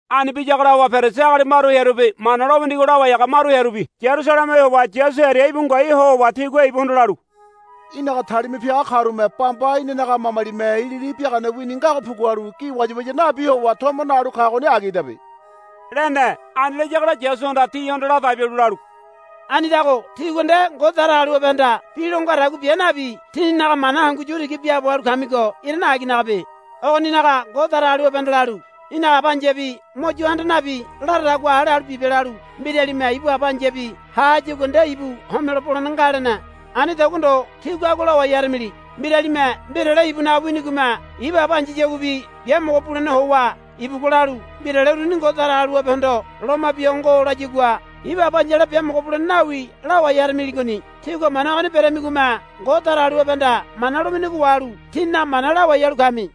Ani biyagola howa Perisi agali maru hearubi Mana lo winigo lawai haga maru hearubi Yarusaleme howa Yasu hearia íbu ngoai ho howa tigua ibuhondo lalu, Í̠naga talima piaga karume bamba inanaga mamalime ilili biagane wini ngago pugualu gi wayawaya nabi howa tomo nalu kagoni agidabe, lene. Ani layagola Yasuhanda tihondo ladai bialu lalu, Anidago tígua nde Ngode Datagaliwabehanda bi lo ngadagua bia nabi tíninaga mana hangu yu tiga biaabo halu kamigo irane aginagabe. Ogoninaga Ngode Datagaliwabehanda lalu, Í̠naga aba ai̱yabi mo yo handa nabi laradagua hale halu bibe, lalu, Mbiralime ibu aba ai̱yabi ha hayagua nde ibu homelo bolene nga, lene. Anidagua ndo tígua agua lawai haramili. Mbiralime mbirale ibunaga winigome ibu aba ai̱yayaguabi biamogo bulene howa ibugua lalu, Mbirale uruni Ngode Datagaliwabehondo loma bia ho ngo, layagua ibu aba ai̱yala biamogo bulene nawi lawai haramiligoni. Tígua mana ogoni beramigome Ngode Datagaliwabehanda mana lo winigo wahalu tíninaga mana lawai halu kami.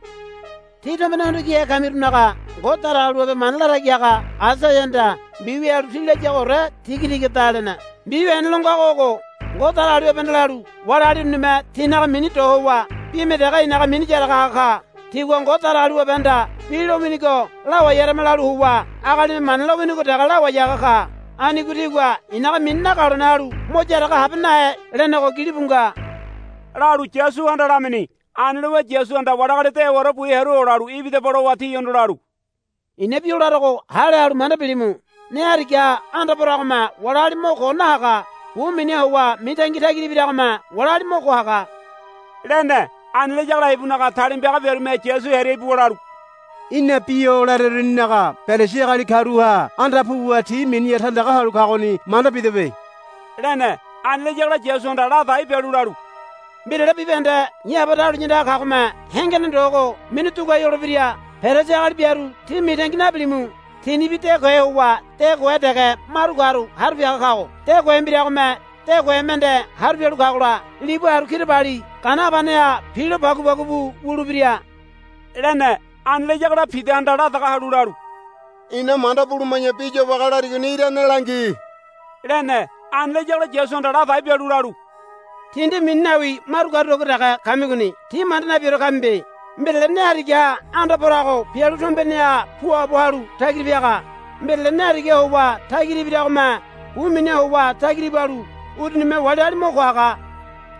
Tí tombene hondo kihe kamirunaga Ngode Datagaliwabe mana latagi haga Aisaiahanda mbiwia halu tí layagoore tigatigada, lene. Mbiwia hene lo ngago ogo, Ngode Datagaliwabehanda lalu, Wali agali urunime tinaga mini do howa bime dege i̱naga mini yaraga haga ka. Tigua Ngode Datagaliwabehanda bi lowinigo lawai harama lalu howa agalime mana lo winigo dege lawai haga ka. Anigo tigua i̱naga mini nagalone halu mo yaraga habe nahe, lenego gilibu nga, lalu Yasuhanda lamini. Ani lowa Yasuhanda wali agali dewaore bu hearu olalu, Ibidaba, lowa tihondo lalu, I̱na bi o larogo hale halu manda bilimu. Ne harigaha anda poragome wali agali mo ko nahaga. Bu miniha howa mitangi tagira ibiragome wali agali mo ko haga, lene. Ani layagola ibunaga talima piaga biarume Yasu hearia ibuwa lalu, Í̠na bi o lareruninaga Perisi agali karuha anda puwa ti miniha tandaga halu kagoni manda bidebe, lene. Ani layagola Yasuhanda ladai bialu lalu, Mbirale bibahende i̱ Aba dahuliya andaga kagome hengene ndogo minu duguai holebira. Perisi agali biaru tí mitangi nabilimu. Tinibi de kohe howa de kohe dege maru karu haru piaga kago. De kohe mbiragome de kohe mende haru pialu kagola libu haru kirabali gana habaneha pilo pagupagu bu wulebira, lene. Ani layagola Pidahanda la daga halu lalu, Ina manda buluma̱ya bi yobage larigoni irane langi, lene. Ani layagola Yasuhanda ladai bialu lalu, Tí nde mini nawi maru karudagua dege kamigoni. Tí manda nabiore kamibe. Mbirale ne harigaha anda porago pialu tombeneha puabo halu tagira piaga. Mbirale ne harigaha howa tagira ibiragome bu miniha howa tagira ibalu urunime wali agali mo ko haga.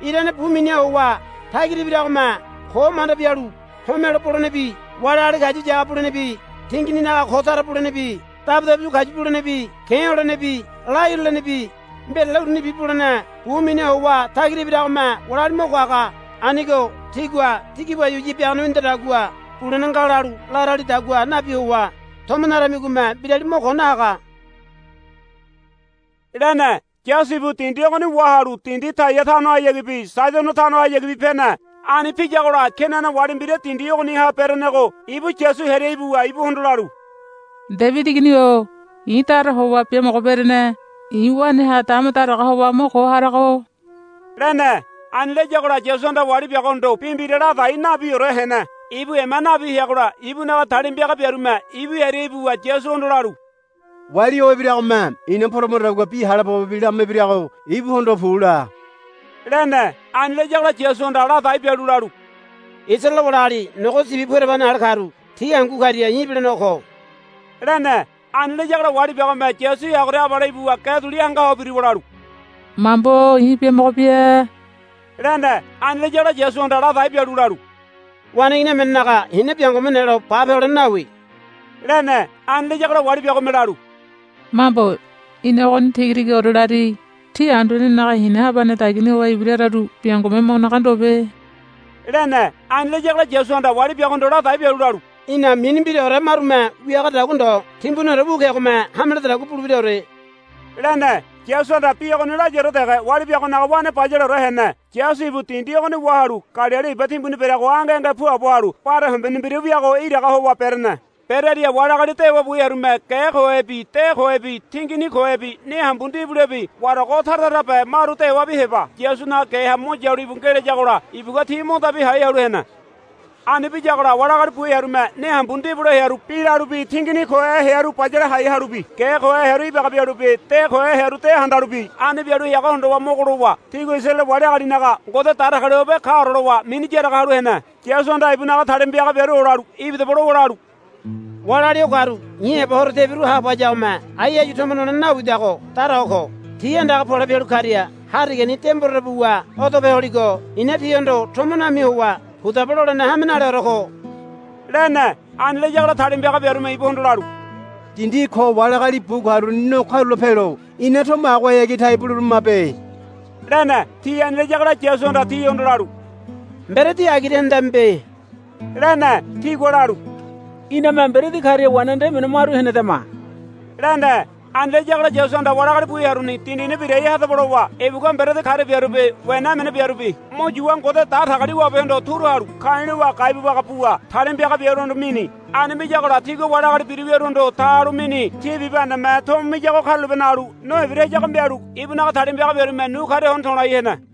Irane bu miniha howa tagira ibiragome ko manda bialu homelo bolenebi wali agali kayu yaga bulenebi tingininaga ko tara bulenebi dabudabu kayu bulenebi ke̱ holenebi la hirulenebi mbirale urunibi bulene bu miniha howa tagira ibiragome wali agali mo ko haga. Anigo tigua tí gi wayawaya biagane winidadagua bulene nga lalu laralidagua nabi howa tomo naramigome mbirali mo ko nahaga, lene. Yasu ibu dindi ogoni wahalu dindi Taia tanohayagibi Saidono tanohayagibi pene. Ani piyagola Kenana wali mbira dindi ogoniha berenego ibu Yasu hearia ibuwa ibuhondo lalu, Debidi Igini-o i̱ dara howa biamogo berene. I̱ waneha dama daraga howa mo ko harago, lene. Ani layagola Yasuhanda wali biagohondo bi mbira ladai nabiore hene. Ibu ema nabi heagola ibunaga talima piaga biarume ibu hearia ibuwa Yasuhondo lalu, Wali o ibiragome ina poramadagua bi hale pobobi lama ibirago ibuhondo, Pu, la, lene. Ani layagola Yasuhanda ladai bialu lalu, Isaraele wali agali nogo sibi pu ereba hene ale karu ti hangu karia i̱ ibilenego ko, lene. Ani layagola wali biagome Yasu heagoria abale ibuwa ge duli hanga ho biruwa lalu, Mambo-o i̱ biamogo bia, lene. Ani layagola Yasuhanda ladai bialu lalu, Waneigini emenenaga hina biangome nelo bape holene nawi, lene. Ani layagola wali biagome lalu, Mambo í̠na ogoni tiga tigaore lari. Ti anduanenaga hina habane dagiani howa ibira hararu biangome mo naga ndobe, lene. Ani layagola Yasuhanda wali biagohondo ladai bialu lalu, Í̠na mini mbiraore marume wiagadagua ndo timbuniore wu kegome hame lededagua bulebiraore, lene. Yasuhanda bi ogoni layaore dege wali biagonaga wane bayaleore hene. Yasu ibu dindi ogoni wahalu Galili iba timbuni bereago ange ange puabo halu bare hombene mbira wiago iraga howa berene. Berearia wali agali dewa bu hearume ge kohebi de kohebi tingini kohebi ne hambu ndibulebi warago tara tarabe maru dewabi heba Yasunaga geha mo yalu íbu ngelayagola ibugua ti mo dabi hai halu hene. Ani biyagola wali agali bu hearume ne hambu ndibule hearu bi lalubi tingini kohe hearu bayale hai halubi ge kohe hearu ibaga bialubi de kohe hearu de handalubi ani bialu heago hondowa mogo lowa tigua Isaraele wali agalinaga Ngode Datagaliwabe kaore lowa mini yaraga halu hene. Yasuhanda ibunaga talima piaga biaru olalu, Ibidaba, lowa lalu, Wali agali o karu i̱ heba horo tebiru haabo hayagome ai áyu tomo nolene nawidago dara ho ko. Ti andaga pole pialu karia harigani de mborere buwa odope holigo i̱na tihondo tomo nami howa, Pudaba, lolene hame naleore ko, lene. Ani layagola talima piaga biarume ibuhondo lalu, Dindi ko wali agali bu karuni no karula pelo ina tomo agohayagi tai buleberamabe, lene. Ti ani layagola Yasuhanda tihondo lalu, Mberedi agira henedamibe, lene. Tigua lalu, Iname mberedi karia wena nde emene maru henedama, lene. Ani layagola Yasuhanda wali agali bu hearuni, Dindini birai hadaba, lowa ibugua mberedi karia biarubi wena emene biarubi mo yuwa Ngode Datagaliwabehondo turu halu ka̱i̱ lowa gai bu baga buwa talima piaga biaruhondo mini. Ani miyagola tigua wali agali biru wiaruhondo ta halu mini. Ti bibahendeme tomo miyago karulape nalu no ibira hayago mialu ibunaga talima piaga biarume nu karia hono to̱lai hene.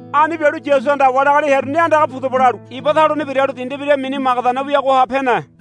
Ani bialu Yasuhanda wali agali hearuni, Andaga pudaba, lalu iba taluni biralu dindi mbira mini Magadana wiagoha pene.